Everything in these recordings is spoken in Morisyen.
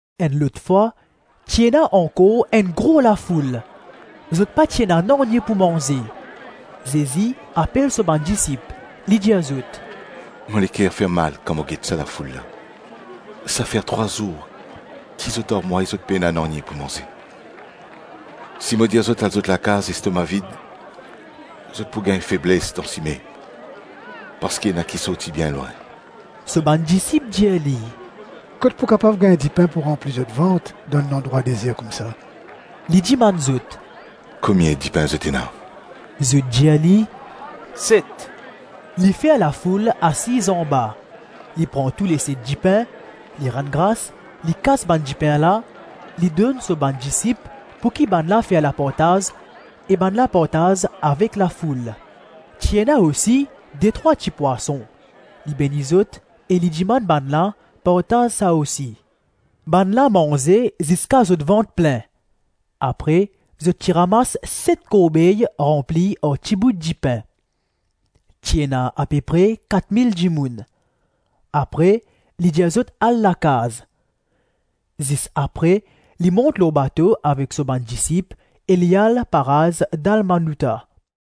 Enn lot fwa, ti ena ankor enn gro lafoul. Zot pa ti ena nanye pou manze. Zezi apel so bann disip, li dir zot, “Mo leker fermal kan mo get sa lafoul la. Sa fer trwa zour ki zot ar mwa e zot pena nanye pou manze. Si mo dir zot al zot lakaz lestoma vid, zot pou gagn febles dan sime parski ena ki sorti bien lwin.” So bann disip dir li, “Kot pou kapav gagn dipin pou ranpli zot vant dan enn landrwa dezer koumsa?” Li dimann zot, “Komie dipin zot ena?” Zot dir li, “Set.” Li fer lafoul asiz anba; li pran touleset dipin, li rann gras, li kas bann dipin la, li donn so bann disip pouki bannla fer lapartaz e bannla partaz avek lafoul. Ti ena osi detrwa tipwason; li beni zot e li dimann bannla partaz sa osi. Bannla manze ziska zot vant plin; apre zot ti ramas set korbey ranpli ar tibout dipin. Ti ena apepre kat mil dimoun. Apre li dir zot al lakaz. Zis apre li mont lor bato avek so bann disip e li al paraz Dalmanouta.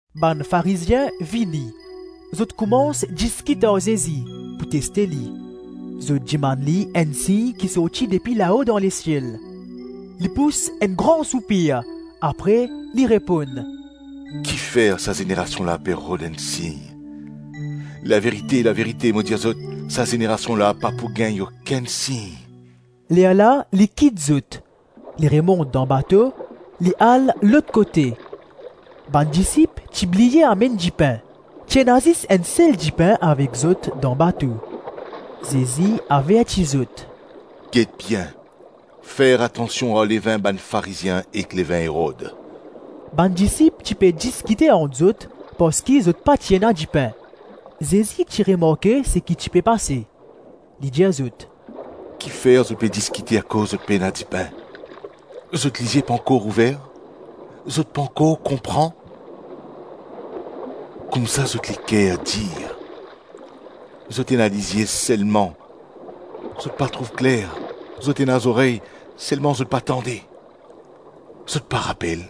Bann Farizien vini; zot koumans diskit ar Zezi; pou teste li, zot dimann li enn sign ki sorti depi lao dan lesiel. Li pous enn gran soupir, apre li reponn, “Kifer sa zenerasion la pe rod enn sign? Laverite, laverite mo dir zot, sa zenerasion la pa pou gagn okenn sign.” Lerla li kit zot, li remont dan bato, li al lot kote. Bann disip ti bliye amenn dipin. Ti ena zis enn sel dipin avek zot dan bato. Zezi averti zot, “Get bien, fer atansion ar levin bann Farizien ek levin Erod.” Bann disip ti pe diskite ant zot parski zot pa ti ena dipin. Zezi ti remarke seki ti pe pase. Li dir zot, “Kifer zot pe diskite akoz zot pena dipin? Zot lizie pankor ouver? Zot pankor konpran? Koumsa zot leker dir? Zot ena lizie, selman zot pa trouv kler; zot ena zorey, selman zot pa tande? Zot pa rapel?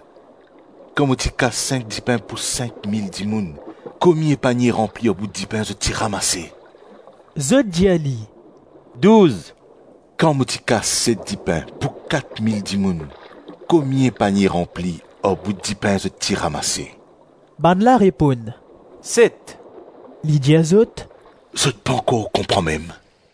Kan mo ti kas sink dipin pou sink mil dimoun, komie panie ranpli ar bout dipin zot ti ramase?” Zot dir li, “Douz.” “Kan mo ti kas set dipin pou kat mil dimoun, komie panie ranpli ar bout dipin zot ti ramase?” Bannla reponn, “Set.” Li dir zot, “Zot pankor konpran mem?”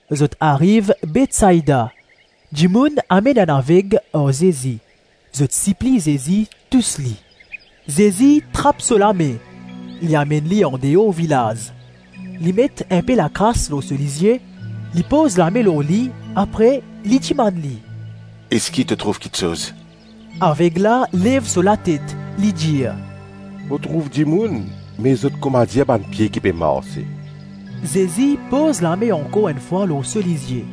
Zot ariv Betsaida. Dimoun amenn enn aveg ar Zezi; zot sipliy Zezi tous li. Zezi trap so lame, li amenn li andeor vilaz. Li met inpe lakras lor so lizie, li poz lame lor li apre li dimann li, “Eski to trouv kiksoz?” Areg la lev so latet, li dir, “Mo trouv dimoun me zot koumadir bann pie ki pe marse.” Zezi poz lame ankor enn fwa lor so lizie.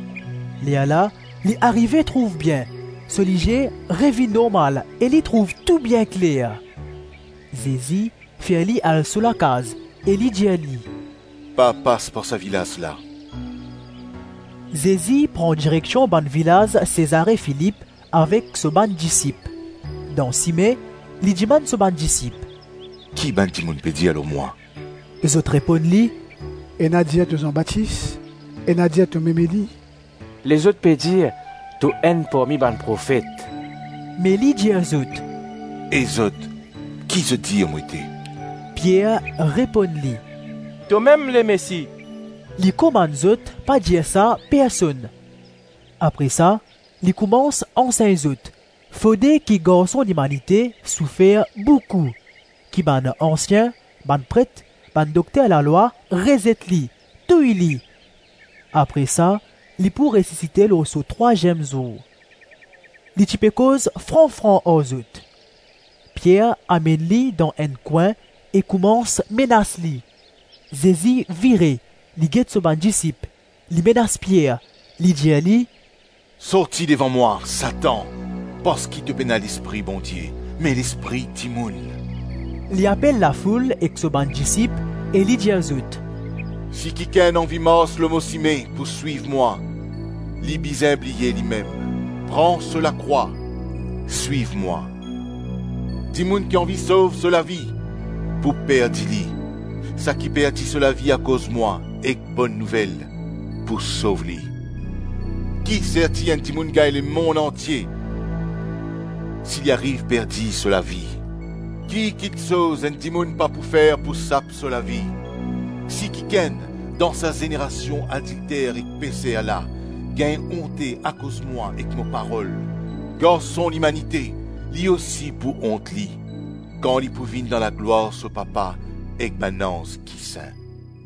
Lerla li arive trouv bien, so lizie revinn normal e li trouv tou bien kler. Zezi fer li al so lakaz, e li dir li, “Pa pas par sa vilaz la.” Zezi pran direksion bann vilaz Sezare-Filip avek so bann disip. Dan sime, li dimann so bann disip, “Ki bann dimoun pe dir lor mwa?” Zot reponn li, “Ena dir to Zan Batis, ena dir tomem Eli, lezot pe dir to enn parmi bann profet.” Me li dir zot, “E zot, ki zot dir mo ete?” Pier reponn li, “Tomem Lemesi.” Li komann zot pa dir sa personn. Apre sa li koumans ansegn zot, fode ki Garson Limanite soufer boukou, ki bann ansien, bann pret, bann dokter lalwa rezet li, touy li, apre sa li pou resisite lor so trwaziem zour. Li ti pe koz fran-fran ar zot. Pier amenn li dan enn kwin e koumans menas li. Zezi vire, li get so bann disip, li menas Pier; li dir li, “Sorti devan mwa, Satan, parski to pena lespri Bondie me lespri dimoun.” Li apel lafoul ek so bann disip e li dir zot, “Si kikenn anvi mars lor mo sime pou swiv mwa, li bizin bliye limem, pran so lakrwa, swiv mwa. Dimoun ki anvi sov so lavi, pou perdi li; saki perdi so lavi akoz mwa ek Bonn Nouvel, pou sov li. Kiserti enn dimoun gagn lemonn antie si li ariv perdi so lavi? Ki kiksoz enn dimoun pa pou fer pou sap so lavi? Si kikenn, dan sa zenerasion adilter ek peser la, gagn onte akoz mwa ek mo parol, Garson Limanite, li osi pou ont li, kan li pou vinn dan laglwar so Papa ek bann anz ki sin.”